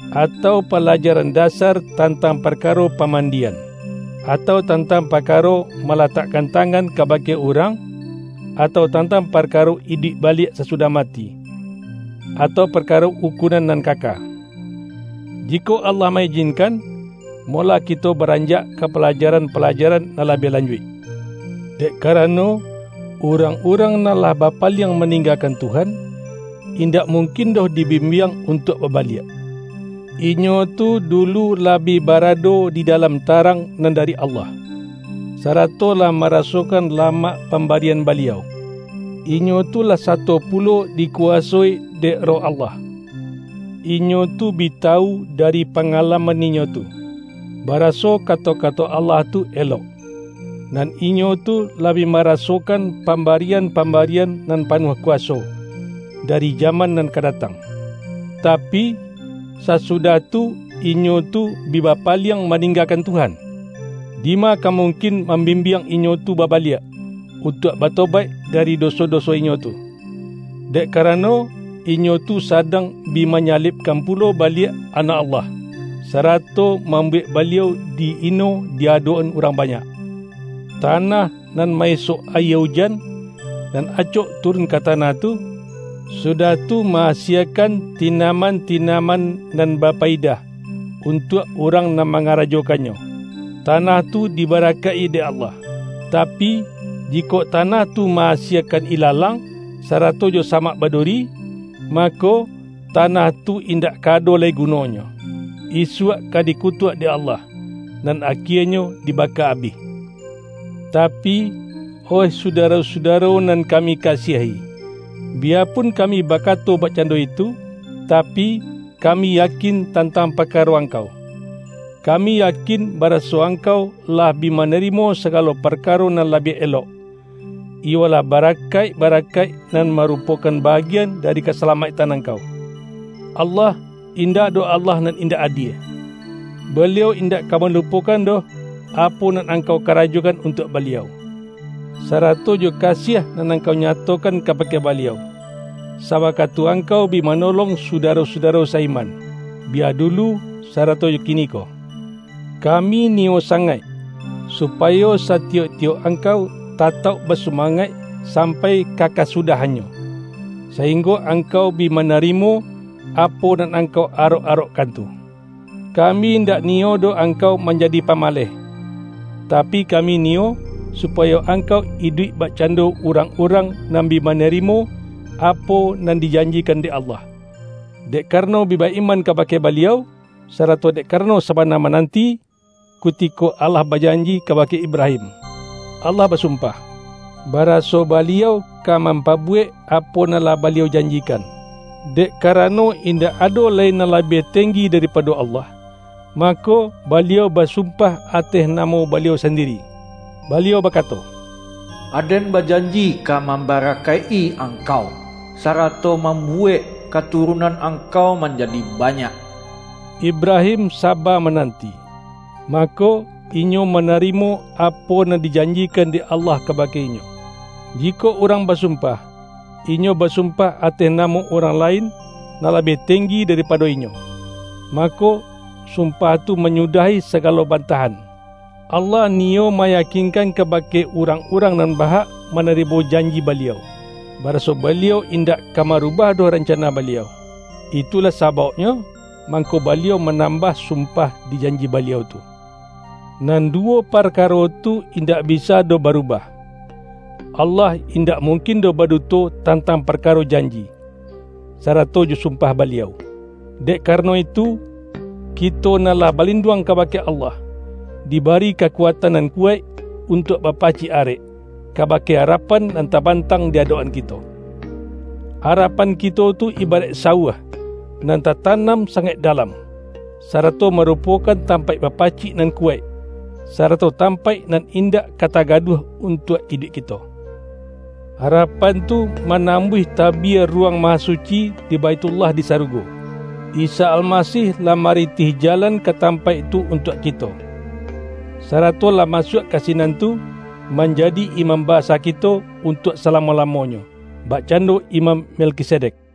atau palaja-ran dasar tantang parkaro pamandi-an, atau tantang parkaro malatakkan tangan kabake urang, atau tantang parkaro iduik baliak sasudah mati, atau parkaro ukunan nan kaka. Ji-kok Allah ma-ijinkan, molah kito ba-ranjak ka palajaran-palajaran nan la-biah lanjuik! Dek karano, urang-urang nan lah bapaliang maninggakan Tuhan, in-dak mungkin doh dibimbiang untuak babaliak. Inyo tu dulu lah bi barado di dalam tarang nan dari Allah, sa-rato lah marasokan lamak pambari-an Baliau. Inyo tu lah sato pulo di-kuwasoi dek Roh Allah. Inyo tu bi tawu dari pangalaman inyo tu, bara-so kato-kato Allah tu elok, nan inyo tu lah bi marasokan pambarian-pam-barian nan panuah kuwaso, dari ja-man nan ka datang. Tapi, sasudah tu inyo tu bi bapaliang maninggakan Tuhan! Dima ka mungkin mambim-biang inyo tu babaliak, untuak bato-baik dari doso-doso inyo tu. Dek ka-rano, inyo tu sadang bi manyalibkan pulo baliak Anak Allah, sarato mam-buwek Baliau di-ino di adok-an urang banyak. Tanah nan ma-isok ayie ujan, nan acok turun ka tanah tu, sudah tu ma-asiekan tinaman-tinaman nan ba-payidah, untuak urang nan mangara-jokannyo, tanah tu dibarakaik-i dek Allah. Tapi, jikok tanah tu ma-asie-kan ilalang, sarato jo samak baduri, mako, tanah tu indak ka ado lai gu-nonyo, isuak ka dikutuak dek Allah, nan akienyo dibaka abih. Tapi, oih sudaro-sudaro nan kami kasiahi, biyapun kami bakato bakcan-do itu, tapi, kami yakin tantang par-karo angkau. Kami yakin, baraso ang-kau lah bi manarimo sagalo parkaro nan labiah elok, iyolah barakaik-ba-rakaik, nan marupokan bagian dari kasalamaiktan angkau. Allah, in-dak doh Allah nan indak adie. Baliau indak ka malupokan doh, apo nan angkau karajokan untuak Baliau, sa-rato jo kasiah nan angkau nyatokan kabake Baliau, sawakatu angkau bi manolong sudaro-sudaro sa-iman, bi-ya dulu sarato jo kiniko. Kami niyo sangaik, supayo satiyok-tiyok angkau tatauk basumangaik sampai ka kasu-dahannyo, sainggo angkau bi manari-mo, apo nan angkau arok-arokkan tu. Kami indak niyo doh angkau man-jadi pamaleh. Tapi kami niyo, supayo angkau iduik bakcando urang-urang nan bi manarimo, apo nan dijanjikan dek Allah, dek karano bi ba-iman ka-bake Baliau, sarato dek karano saba mananti. Kutiko Allah bajanji kabake Ibrahim, Allah basumpah, baraso Baliau ka mampabuwek apo nan lah Baliau janjikan. Dek karano indak ado lai nan labiah tenggi daripado Allah, mako, Baliau basumpah ateh namo Baliau sandiri. Baliau baka-to,”Aden bajanji ka mambarakaik-i angkau, sarato mambuwek katurunan angkau manjadi banyak.” Ibrahim saba mananti, mako, inyo manarimo apo nan dijanjikan dek Allah kabake inyo. Jikok urang basumpah, inyo basumpah ateh namo urang lain, nan labiah tenggi daripado inyo, mako, sumpah tu manyudahi sagalo bantah-an. Allah niyo mayakinkan kabake urang-urang nan ba-hak manarimo janji Baliau, baraso Baliau indak ka marubah doh rancana Baliau. Itulah sabauknyo, mangko Baliau manam-bah sumpah di janji Baliau tu. Nan duwo parkaro tu indak bisa doh ba-rubah: Allah indak mungkin doh ba-duto tantang parkaro janji, sarato jo sumpah Baliau. Dek karano itu, kito nan lah balinduang kabake Allah, di-bari kakuatan nan kuwaik untuak ba-pacik arek, kabake arapan nan taban-tang di adok-an kito. Arapan kito tu ibaraik sawuah, nan tatanam sa-ngaik dalam, sarato marupokan tampaik bapacik nan kuwaik, sarato tam-paik nan indak ka tagaduah untuak iduik kito. Arapan tu manambuih ta-bia Ruwang Mahasuci di Baithullah di sarugo. Isa Almasih lah marintih ja-lan ka tampaik tu untuak kito, sara-to lah masuak ka sinan tu, manjadi Imam Basa kito untuak salamo-lamo-nyo, bakcando Imam Melkisedek.